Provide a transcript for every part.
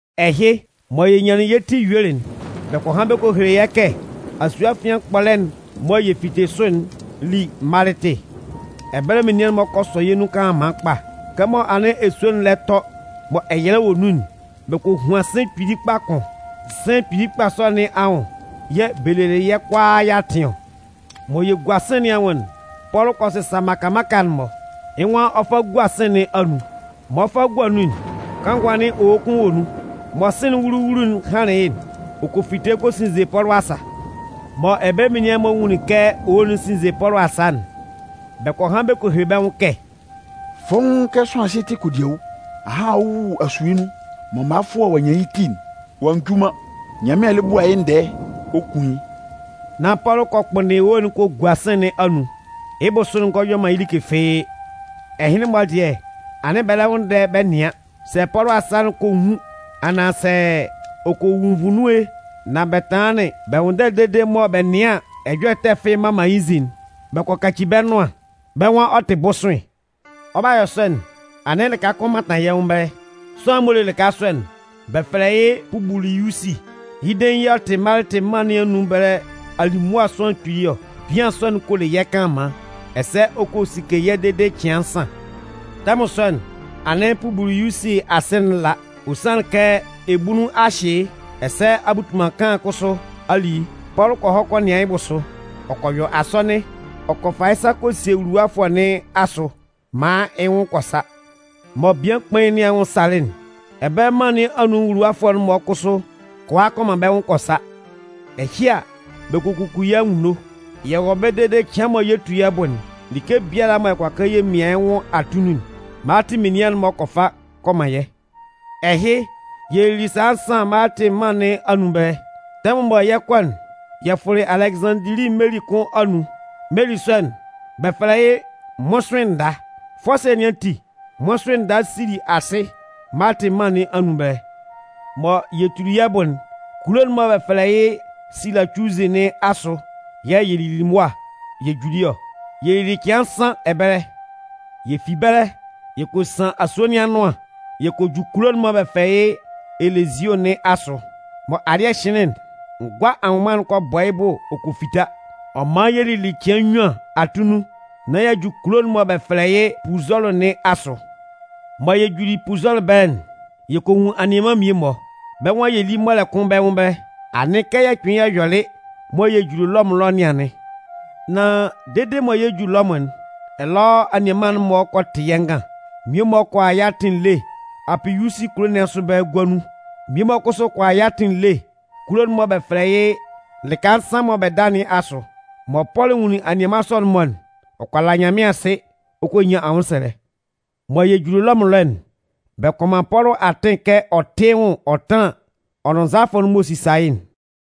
Ɛhɩ, mɔ yɛ nyanlɩn yɛ́ ti yuelɩ'n, bɛ kɔ han bɛ kɔ hele yɛ́ kɛ asue afian kpɔlɛ'n mɔ yɛ fitelɩ sʋ'n li Malɩtɩ. Ɛbɛlɛ menian'n-mɔ kɔ sɔ yɛ́ nun kanlanman kpa. Kɛmɔ anɩn esue'n lɛ tɔ mɔ ɛyɛlɛ wɔ nun'n, bɛ kɔ huan sɩ̂n kpili kpa kʋn. Sɩ̂n kpili sɔ nɩn anwʋn yɛ̂ bɛ lelɩ yɛ́ kʋalaa yɛ́ atɩn ɔ. Mɔ yɛ gua sɩ̂n nɩn anwʋn'n, Pɔlʋ kɔ sɩsa mmaka mmaka'n-mɔ, yɩ́ nwan ɔ 'fa gua sɩ̂n nɩn anun. Mɔ ɔ 'fa gua nun'n, kanngʋ anɩn owo kʋn wɔ nun. Mɔ sɩ̂n'n wulu-wulu'n hanlɩn yɩ́'n, ɔ kɔ fite kɔ sinze Pɔlʋ asa. Mɔ ɛbɛlɛ menian'n-mɔ nwunlin kɛ owo'n sinze Pɔlʋ asa'n, bɛ kɔ han bɛ kɔ hele bɛ́ nwʋn kɛ: “Fɔ́ʋ́n kɛ sʋanlan ɛhɩ tɩ kodiawu! Ahan ɔ 'wu asue nun mɔ mʋafʋɛ ɔ'a nyan yɩ́ ti'n, ɔ'a nju man, Nyanmɩan lɛ bua yɩ́ ndɛɛ ɔ kun yɩ́.” Nan Pɔlʋ kɔ kpʋnndɩn owo'n kɔ gua sɩ̂n nɩn anun. Yɩ́ bʋsʋ'n ngɔ yɔ man yɩ́ like fɩ́ɩ́. Ɛhɩnlɩn-mɔ dɩɛ, anɩn bɛ lɛ nwʋnndɛ bɛ nɩan, sɛ Pɔlʋ asa'n kɔ nwun, anaan sɛ ɔ kɔ wu nvu nun e. Nan bɛ tanlanlɩn bɛ nwʋnndɛlɩ dede mɔ bɛ nɩan an, ɛjɔlɛ ɛtɛ fɩ́ɩ́ mma man yɩ́ nzin'n, bɛ kɔ kaci bɛ́ nʋan. Bɛ́ nwan ɔ tɩ bʋsʋɩn. Ɔ 'ba yɔ sɔ'n, anɩn lɩka kʋn mantan yɛ́ nwʋn ɛbɛlɛ. Sʋanlan'n m'ɔ le lɩka sɔ'n, bɛ fɛlɛ yɩ́ Pubiliyusi. Yɩ́ dein yɛ̂ ɔ tɩ Malɩtɩ mân nɩn anun ɛbɛlɛ alimʋa sʋanlan kpili ɔ. Bian sɔ'n kɔ le yɛ́ kanlanman, ɛsɛ ɔ kɔ sike yɛ́ dede cɩan nsan. Tɛmʋn sɔ'n, anɩn Pubiliyusi asɩ'n la. Ɔ sanlɩn kɛ ebunnun a hyɩ yɩ́, ɛsɛ abutunman kanlan kʋsʋ a li yɩ́. Pɔlʋ kɔ hɔ kɔ nɩan yɩ́ bʋsʋ, ɔ kɔ yɔ asɔnɩn, ɔ kɔ fa yɩ́ sa kɔ sie wuluwafʋɛ nɩn asʋ maan yɩ́ nwʋn kɔ sa. Mɔ bian kpain'n nɩn anwʋn salɩ'n, ɛbɛlɛ mân nɩn anun nwuluwafʋɛ'n-mɔ kʋsʋ kɔ a kɔ man bɛ́ nwʋn kɔ sa. Ɛhɩ a, bɛ kɔ kuku yɛ́ anwunno. Yɛ wɔ ɛbɛlɛ dede cɩan mɔ yɛ 'tu yɛ́ bʋ'n, like biala mɔ yɛ kʋala kɛ yɛ mian yɩ́ nwʋn atunnun'n, Malɩtɩ menian'n-mɔ kɔ fa kɔ man yɛ́. Ɛhɩ, yɛ lili sala nsan Malɩtɩ mân nɩn anun ɛbɛlɛ. Tɛmʋn mɔ yɛ 'kɔ'n, yɛ fʋlɩ Alɛgɩzanndili meli kʋn anun. Meli sɔ'n, bɛ fɛlɛ yɩ́ “Mmʋsʋɩn nda”. Fɔsɩɛ nɩn ati, Mmʋsʋɩn nda sili asɩ Malɩtɩ mân nɩn anun ɛbɛlɛ. Mɔ yɛ tuli yɛ́ bʋ'n, kulo'n mɔ bɛ fɛlɛ yɩ́ Silacuzɩ nɩn asʋ yɛ̂ yɛ lili mʋa yɛ juli ɔ. Yɛ lili cɩan nsan ɛbɛlɛ. Yɛ fi ɛbɛlɛ, yɛ kɔ san asue nɩn anʋan yɛ kɔ ju kulo'n mɔ bɛ fɛlɛ yɩ́ Elezio nɩn asʋ. Mɔ alɩ́ɛ hɩnlɩn'n, ngʋa anwʋnman'n kɔ bɔ yɩ́ bʋ ɔ kɔ fita. Ɔ man yɛ lili cɩan nnyuan atunnun nán y'a ju kulo'n mɔ bɛ fɛlɛ yɩ́ Puzɔlʋ nɩn asʋ. Mɔ yɛ juli Puzɔlʋ ɛbɛlɛ'n, yɛ kɔ nwun anianman mmie-mɔ. Bɛ́ nwan yɛ lí mɔlɛ kʋn bɛ́ nwʋn ɛbɛlɛ. Anɩn kɛ yɛ kpɩnlɩn yɛ yɔlɩ mɔ yɛ juli Lɔmʋn ɛlɔ nɩn anɩn. Nan dede mɔ yɛ 'ju Lɔmʋn'n, ɛlɔ anianman'n-mɔ kɔ tɩ yɛ́ ngan. Mmie-mɔ kɔ a yɛ́ atɩn ele Apiyusi kulo nɩn asʋ ɛbɛlɛ Gua nun. Mmie-mɔ kʋsʋ kɔ a yɛ́ atɩn ele kulo'n mɔ bɛ fɛlɛ yɩ́ Lɩka Nsan mɔ bɛ Da nɩn asʋ. Mɔ Pɔlʋ nwunlin anianman sɔ'n-mɔ'n, ɔ kɔ la Nyanmɩan asɩ ɔ kɔ nyan anwʋnsɛlɛ. Mɔ yɛ juli Lɔmʋn ɛlɔ'n, bɛ kɔ man Pɔlʋ atɩn kɛ ɔ tɩ́ yɩ́ nwʋn ɔ tánlan ɔ nʋn nzalafʋ'n m'ɔ sisa yɩ́'n.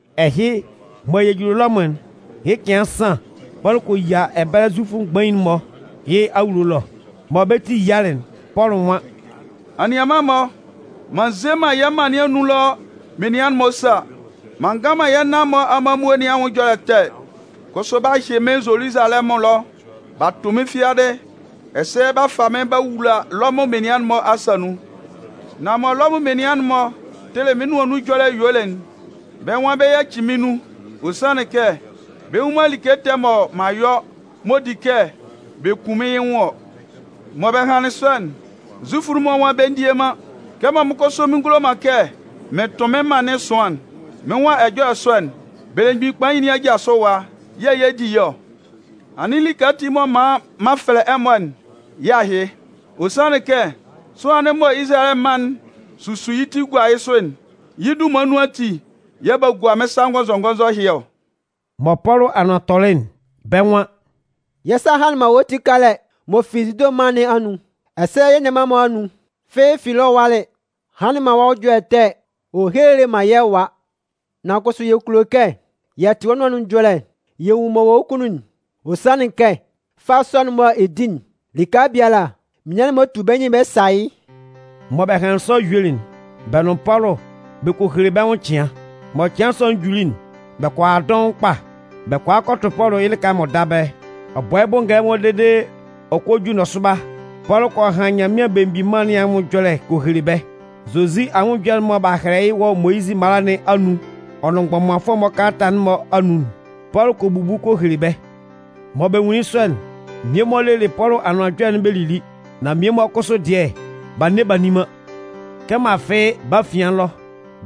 Ɛhɩ mɔ yɛ juli Lɔmʋn'n, yɩ́ cɩan nsan, Pɔlʋ kɔ yia ɛbɛlɛ Zufʋ mgbain'n-mɔ yɩ́ awulo ɛlɔ. Mɔ bɛ́ ti yialɩ'n, Pɔlʋ nwan: “Anianman-mɔ, m'an nze man yɛ́ mân nɩn anun ɛlɔ menian'n-mɔ sa, m'an ngan man yɛ́ nan-mɔ amanmuo nɩn anwʋn ɛjɔlɛ ɛtɛ, kʋsʋ b'a hyɩ mɩ́n Zoluzalɛmʋn ɛlɔ b'a tʋ mɩ́n fiadɩ ɛsɛ b'a fa mɩ́n b'a wula Lɔmʋn menian'n-mɔ asa nun. Nan mɔ Lɔmʋn menian'n-mɔ tɩlɩ mɩ́n nʋan nun ɛjɔlɛ yuelɩ'n, bɛ́ nwan bɛ 'yaci mɩ́n nun. Ɔ sanlɩn kɛ, bɛ nnwun man like ɛtɛ mɔ m'an yɔ m'ɔ di kɛ bɛ kun mɩ́n yɩ́ nwʋn ɔ. Mɔ bɛ hanlɩn sɔ'n, Zufʋ'n-mɔ nwan bɛ ndie man. Kɛmɔ mɩ́n kʋsʋ mɩn ngulo man kɛ mɩn tʋn mɩn mân nɩn ɛsʋan'n, mɩ́n nwan ɛjɔlɛ sɔ'n, belemgbin kpain nɩn aja sʋ ɛwa yɛ̂ yɛ 'di yɩ́ ɔ. Anɩn like ati m'ɔ man m'an fɛlɛ ɛmɔ'n, yɩ́ ahɩ. Ɔ sanlɩn kɛ, sʋanlan'n mɔ Izalayɛ mân'n susu yɩ́ ti gua yɩ́ sʋ'n, yɩ́ dunman nun ati yɛ̂ b'a gua mɩ́n sa ngɔnzɔngɔnzɔ ɛhɩ ɔ.” Mɔ Pɔlʋ anʋan tɔlɩ'n, bɛ́ nwan: “Yɛ́ sa hanlɩn man wɔ́ ti kalata m'ɔ fi Zude mân nɩn anun. Ɛsɛ yɛ́ nianman'n-mɔ anun fɩ́ɩ́ fi ɛlɔ ɔ walɩ hanlɩn man wɔ́ nwʋn ɛjɔlɛ ɛtɛ ɔ helelɩ man yɛ́ ɛwa. Nan kʋsʋ yɛ kulo kɛ yɛ tɩ wɔ́ nʋan nun ɛjɔlɛ yɛ nwun m'ɔ wɔ wɔ́ kunnun'n. Ɔ sanlɩn kɛ fâ sɔ'n mɔ ɛ di'n, lɩka biala, menian'n-mɔ tu bɛ́ nyɩn bɛ sa yɩ́.” Mɔ bɛ hanlɩn sɔ yuelɩ'n, bɛ nʋn Pɔlʋ bɛ kɔ hele bɛ́ nwʋn cɩan. Mɔ cɩan sɔ'n juli'n, bɛ kɔ a dɔʋn kpa. Bɛ kɔ a kɔ tʋ Pɔlʋ yɩ́ lɩka m'ɔ da ɛbɛlɛ. Ɔ bɔ yɩ́ bʋ ngɛlɛmɔ dede ɔ kɔ ju nɔsʋba, Pɔlʋ kɔ han Nyanmɩan Belemgbin Mân nɩn anwʋn ɛjɔlɛ kɔ hele bɛ́. Zozi anwʋn ɛjɔlɛ'n mɔ b'a hɛlɛ wɔ Moyizɩ mala nɩn anun ɔ nʋn mgbɔmanfʋɛ'n-mɔ kalata'n-mɔ anun'n, Pɔlʋ kɔ bubu kɔ hele bɛ́. Mɔ bɛ nwunlin yɩ́ sɔ'n, mmie-mɔ lelɩ Pɔlʋ anʋan ɛjɔlɛ'n bɛ lili. Nan mmie-mɔ kʋsʋ dɩɛ, b'a nne b'a nni man. Kɛmɔ afɩ bɛ́ afian ɛlɔ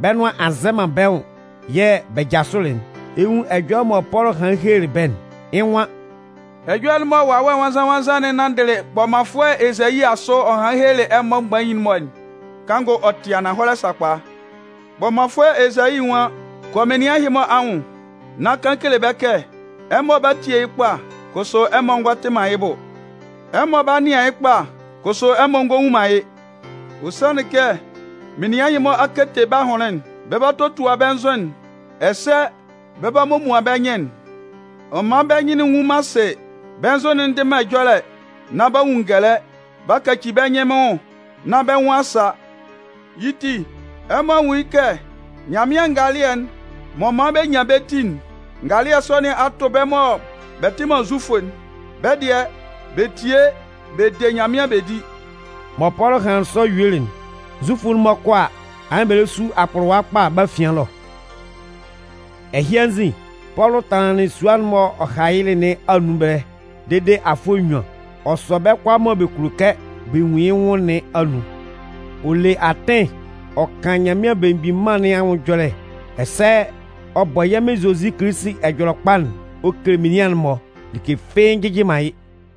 bɛ́ nʋan a nzɛ man bɛ́ nwʋn yɛ̂ bɛ jasʋlɩ'n, ɛ 'nwun ɛjɔlɛ mɔ Pɔlʋ hanlɩn helelɩ bɛ́'n. Yɩ́ nwan: “Ɛjɔlɛ'n mɔ Wawɛ Nwannzan-nwannzan'n nanndɩlɩ kpɔmanfʋɛ Ezayi asʋ ɔ hanlɩn helelɩ ɛmɔ mgbain'n-mɔ'n, kanngʋ ɔ tɩ ananhɔlɛ sakpa! Kpɔmanfʋɛ Ezayi nwan: Kɔ menian ɛhɩ-mɔ anwʋn nán kan kele bɛ́ kɛ: Ɛmɔ 'ba tie yɩ́ kpa, kʋsʋ ɛmɔ ngɔ tɩ man yɩ́ bʋ. Ɛmɔ 'ba nɩan yɩ́ kpa, kʋsʋ ɛmɔ ngɔ nwun man yɩ́. Ɔ sanlɩn kɛ menian ɛhɩ-mɔ a kete bɛ́ ahʋnlɩn'n, b'a totua bɛ́ nzʋ'n ɛsɛ b'a momuan bɛ́ nyɩn'n. Ɔ man bɛ́ nyɩn'n nnwun man asɩ, bɛ́ nzʋ'n ndɩ man ɛjɔlɛ nán b'a nwun ngɛlɛ b'a kaci bɛ́ nyɩn mɩ́n nwʋn nán bɛ́ nwʋn a sa. “Yɩ́ ti, ɛmɔ nwún yɩ́ kɛ Nyanmɩan ngalɩɛ'n m'ɔ man bɛ nyan bɛ́ ti'n, ngalɩɛ sɔ nɩn a tʋ bɛ́ mɔ bɛ tɩ man Zufʋ'n. Bɛ́ dɩɛ, bɛ tie bɛ de Nyanmɩan bɛ di.” [ Mɔ Pɔlʋ hanlɩn sɔ yuelɩ'n, Zufʋ'n-mɔ 'kɔ a, anɩn bɛ lɛ su akpʋlʋwa kpa bɛ́ afian ɛlɔ.] Ɛhɩ anzin, Pɔlʋ tanlanlɩn sua'n m'ɔ hayɩlɩ nɩn anun ɛbɛlɛ dede afʋɛ nnyuan. Ɔ sɔ bɛ́ kʋalaa mɔ bɛ kulo kɛ bɛ nwun yɩ́ nwʋn nɩn anun. Ɔ le atɩn ɔ kan Nyanmɩan Belemgbin Mân nɩn anwʋn ɛjɔlɛ, ɛsɛ ɔ bɔ yɛ́ Mɩn Zozi Kilisi Ɛjɔlɛkpa'n ɔ kele menian'n-mɔ, like fɩ́ɩ́ njɩjɩ man yɩ́.